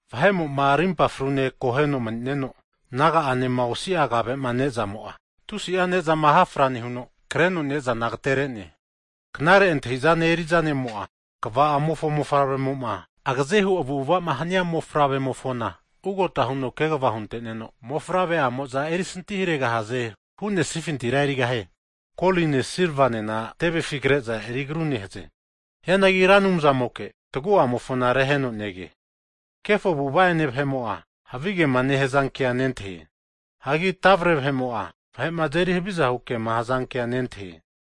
Vahe'mo'ma rimpa frune akoheno manineno naga'anema osia kave'ma ne'zamo'a, tusi'a ne'zama hafra nehuno kreno ne'zana agatere'ne. Knare antahizane eriza ne'mo'a, kva'amofo mofavre'mo'ma agaze hu avu'avama hania mofavremofona ugota huno kegva hunte'neno, mofavre'amo'za erisanti haregahaze huzmante'nesafintira erigahie. Koline silvanena tevefi kre'za eri agru nehaze. Hianagi Ra Anumzamoke tagu'amofona reheno nege. Kefo avu'ava'ene vahe'mo'a, havigema nehazankea nentahie. Hagi tavre vahe'mo'a, vahe'ma azeri haviza hukema hazanke nentahie.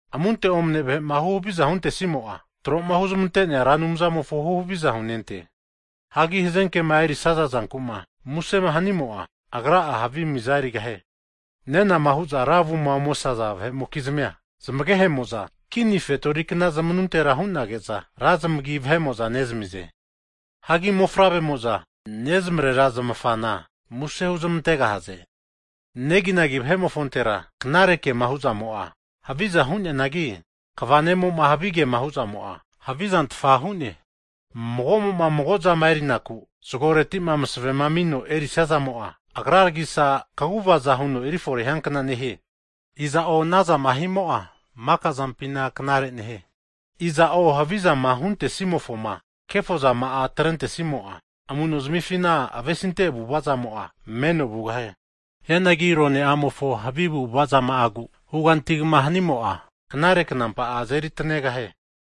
Amunte omane vahe'ma huhaviza huntesia vahe'mo'a, tro'ma huzmante'nea Ra Anumzamofo huhaviza hunente. Hagi hazenkema erisaza zanku'ma muse hanimo'a, agra'a havi mizana erigahie. Nenama huza ra avuma omesaza vahe'mokizmia, zamagehe'mo'za, kini fetorikna zamanuntera hu'nage'za, ra zamagi vahe'mo'za nezamize. Hagi mofavre'mo'za nezmarera zmafana muse huzmantegahaze. Neginagi vahe'mofontera knare ke'ma hu'zamo'a, haviza hu'neanagi, kva ne'mo'ma havigema hu'zamo'a, havizantfa hu'ne. Mago'mo'ma mago zama erinaku zgoreti'ma maseve'ma amino erisiazamo'a, agraragisa kaguvaza huno efore hiankna nehie. Iza'o anazama himo'a maka zampina knare nehie. Iza'o havizama huntesimofoma kefo zama'a atrentesimo'a, amu'nozanifina avesinte avu'avazamo'a, meno vugahie. Hianagi arone'amofo havi avu'avazama'agu hugantigama hanimo'a, knare knampa'a azeri atanegahie.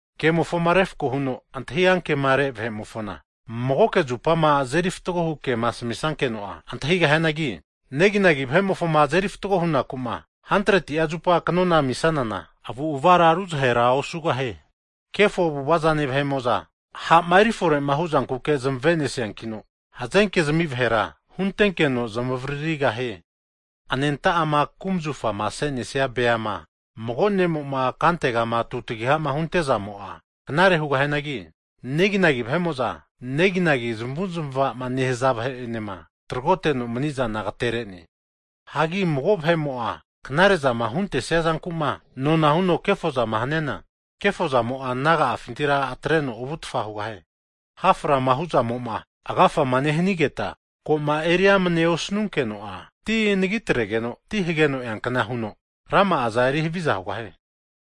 Kemofoma refko huno antahi ankemare vahe'mofona, magoke zupama azeri fatgo hu kema asamisankeno'a antahigahianagi, neginagi vahe'mofoma azeri fatgo hunaku'ma 100ti'a zupa knona ami'sanana, avu'avara ruzahera osugahie. Kefo avu'avazane vahe'mo'za, ha'ma erifore hu zankuke zamave'nesiankino, hazenke'zami vahera huntenkeno zmavaririgahie. Anenta'ama kumzafama ase'nesaza beama, mago ne'mo'ma kantegama tutagihama huntezamo'a knare hu'neanagi, neginagi vahe'mo'za neginagi zamavu'zamavama nehaza vahe'enema tragoteno manizana agatere'ne. Hagi mago vahe'mo'a knare'zama magamofoma huntesia zanku'ma, nona huno kefozama huntesia vahe'mofona, kefo zamo'a naga'afintira atreno ovutfa hugahie. Ha' frama hu'zamo'ma agafama nehanigeta, koma eri amne osanunkeno'a, ti anagi atregeno ti hageno eankna huno rama'aza eri haviza hugahie.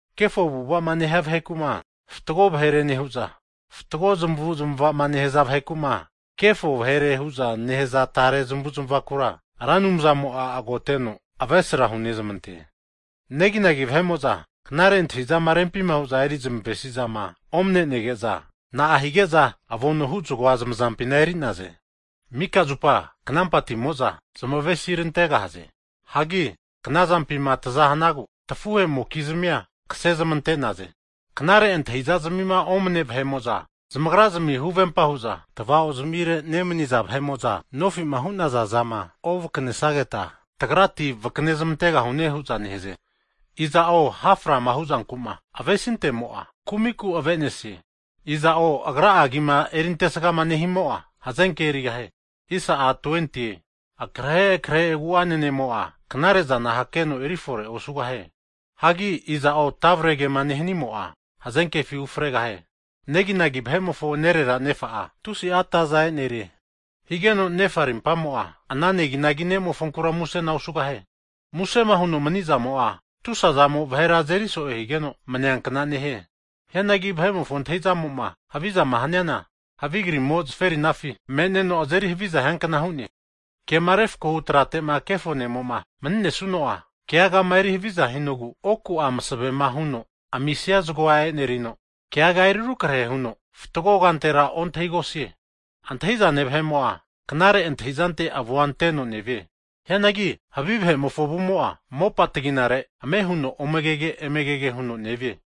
Kefo avu'avama nehia vaheku'ma fatgo vahere nehu'za, fatgo zmavu'avazama nehaza vaheku'ma, kefo vahere hu'zama nehaza tare zmavu'zmavakura, Ra Anumzamo'a agoteno avesra hunezmante. Neginagi vahe'mo'za knare antahi'zama rempima hu'za eri zmave'sizama omane'nege'za, na'a higeza avono hu zgoa zamazampina eri'naze? Mika zupa knampatimo'za zmavesirantegahaze. Hagi knazampima tza hanagu tafuhe'mokizmia kasezmante'naze. Knare antahi'zazmima omane vahe'mo'za zamagrazmi huvempa hu'za, tava'ozmire nemaniza vahe'mo'za nofima hu'naza zama ovakanesageta, tagrati vakanezmantegahune hu'za nehaze. Iza'o ha'frama hu'zankuma avesintemo'a, kumiku avenesie. Iza'o agra'a agima erintesgama nehimo'a, hazenke erigahie. Akrehe akrehe agu'ane ne'mo'a, knare zana hakeno erifore osugahie. Hagi iza'o tavre kema nehanimo'a, hazenkefi ufregahie. Neginagi vahe'mofo nerera nefa'a, tusi'a ataza e'nerie. Higeno nefa rimpamo'a, ana neginagi ne'mofonkura musena osugahie. Musema huno mani'zamo'a, tusazamo vahera azeri so'e higeno maniankna nehie. Hianagi vahe'mofo antahizamo'ma havizama haniana, havi krimo zaferinafi me'neno azeri haviza hiankna hu'ne. Kema refkohu tratema kefo ne'moma maninesuno'a, keagama eri haviza hinogu oku'a masevema huno amisia zgoa e'nerino, keaga eri rukrahe huno fatgo kantera ontahigosie. Antahi'zane vahe'mo'a knare antahizante avua anteno nevie. Hianagi havi vahe'mofo avumo'a, mopa ataginare ame huno omegege, emegege huno nevie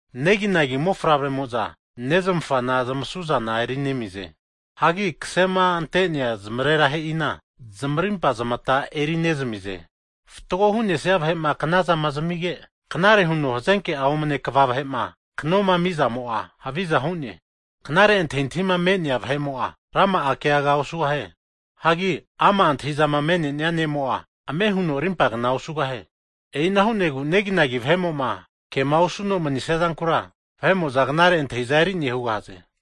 Neginagi mofavremo'za nezmafana zamasuzana eri nezamie. Hagi kasema ante'nea zamarerahe'ina, zmarimpa zamata eri'nezamize. Fatgo hu'nesia vahe'ma knazama zamige, knare huno hazenke'a omane kva vahe'ma knoma ami'zamo'a, haviza hu'ne. Knare antahintahima me'nea vahe'mo'a, rama'a keaga osugahie. Hagi ama' antahizama me'nenia ne'mo'a, ame huno rimpagna osugahie. E'ina hu'negu neginagi vahe'mo'ma kema osuno manisia zankura, vahe'mo'za knare antahiza eri'ne hugahaze.